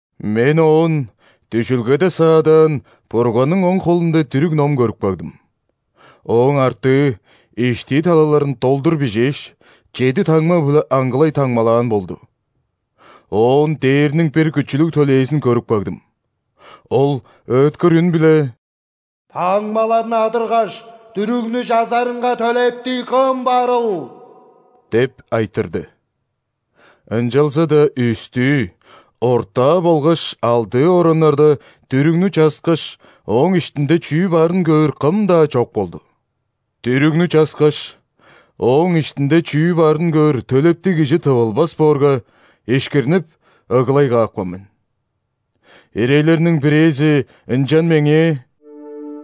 Мен оон дүжүлгеде саадаан Бурганның оң холунда дүрүг-ном көрүп кагдым. Ооң артыы, иштии талаларын долдур бижээш, чеди таңма-биле аңгылай таңмалаан болду. Оон дээрниң бир күчүлүг төлээзин көрүп кагдым, ол ыыткыр үн-биле: «Таңмаларны адыргаш, дүрүгнү чазарынга төлептиг кым барыл?» – деп айтырды. Ынчалза-даа үстүү, ортаа болгаш алдыы ораннарда дүрүгнү часкаш, ооң иштинде чүү барын көөр кым-даа чок болду. Дүрүгнү часкаш, ооң иштинде чүү барын көөр төлептиг кижи тывылбас боорга, ишкирнип ыглай каапкан мен. Ирейлерниң бирээзи ынчан меңээ: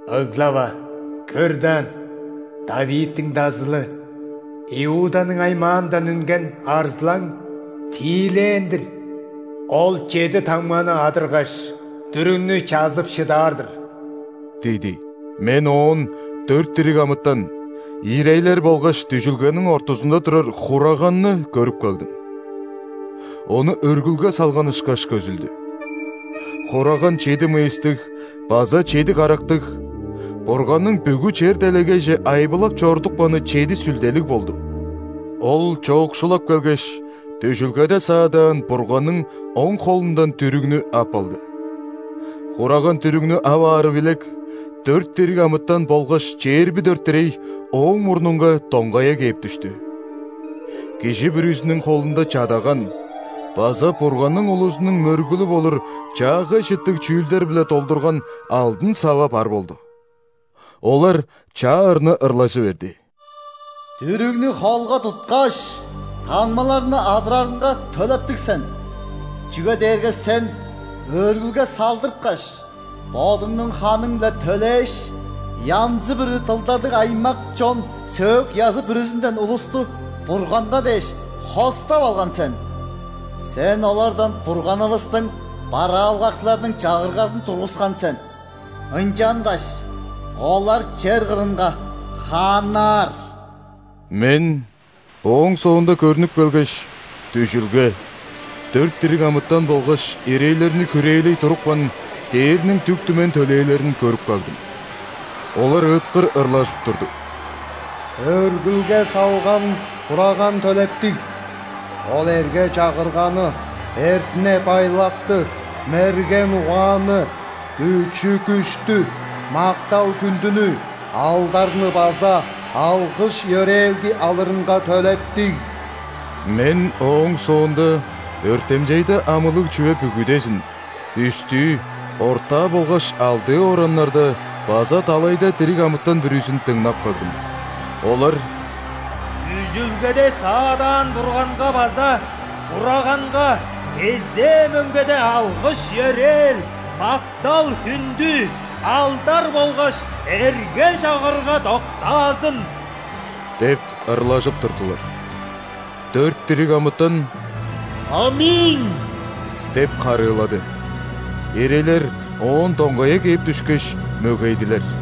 «Ыглава! Көр даан, ·Давидтиң Дазылы, Иуданың аймаандан үнген Арзылаң тиилээн-дир! Ол чеди таңманы адыргаш, дүрүгнү чазып шыдаар-дыр» – диди. Мен оон дөрт дириг амытан, ирейлер болгаш дүжүлгениң ортузунда турар Хураганны көрүп кагдым. Ону өргүлге салган ышкаш көзүлдү. Хураган чеди мыйыстыг база чеди карактыг (Бурганның бүгү чер-делегейже айбылап чорудупканы чеди сүлделиг) болду. Ол чоокшулап келгеш, дүжүлгеде саадаан Бурганның оң холундан дүрүгнү ап алды. Хураган дүрүгнү ап аары билек, дөрт дириг амытан болгаш чээрби дөрт ирей Ооң мурнунга доңгая кээп дүштү. Кижи бүрүзүнүң холунда чадаган база Бурганның улузунуң мөргүлү болур чаагай чыттыг чүүлдер-биле долдурган алдын сава бар болду. Олар чаа ырны ырлажы берди:«Дүрүгнү холга туткаш, таңмаларны адырарынга төлептиг сен!Чүге дээрге Сен өргүлге салдырткаш, Бодуңнуң ханың-биле төлээш,янзы-бүрү дылдарлыг аймак, чон, сөөк-язы бүрүзүнден улустуБурганга дээш хостап алган сен! Сен олардан Бурганывыстың бараалгакчыларыныңчагыргазын тургускан сен,ынчангаш олар чер кырынга хааннаар». Мен ооң соонда көрнүп келгеш, дүжүлге, дөрт дириг амытан болгаш ирейлерни хүрээлей турупкан дээрниң дүк-түмен төлээлерин көрүп кагдым. Олар ыыткыр ырлажып турду:«Өргүлге салган Хураган төлептиг!Ол эрге-чагырганы, эртине-байлакты, мерген угаанны,күчү-күштү, мактал-хүндүнү, алдарныбаза алгыш-йөрээлди алырынга төлептиг!» Мен ооң соонда өртемчейде амылыг чүве бүгүдезин – үстүү, ортаа болгаш алдыы ораннарда база далайда дириг амытан бүрүзүн дыңнап кагдым. Олар:«Дүжүлгеде саадаан Бурганга база Хурагангакезээ мөңгеде алгыш-йөрээл, мактал-хүндү,алдар болгаш эрге-чагырга доктаазын!» –деп ырлажып турдулар. Дөрт дириг амытан: «·Аминь!» – деп харыылады. Ирейлер оон доңгая кээп дүшкеш, мөгейдилер.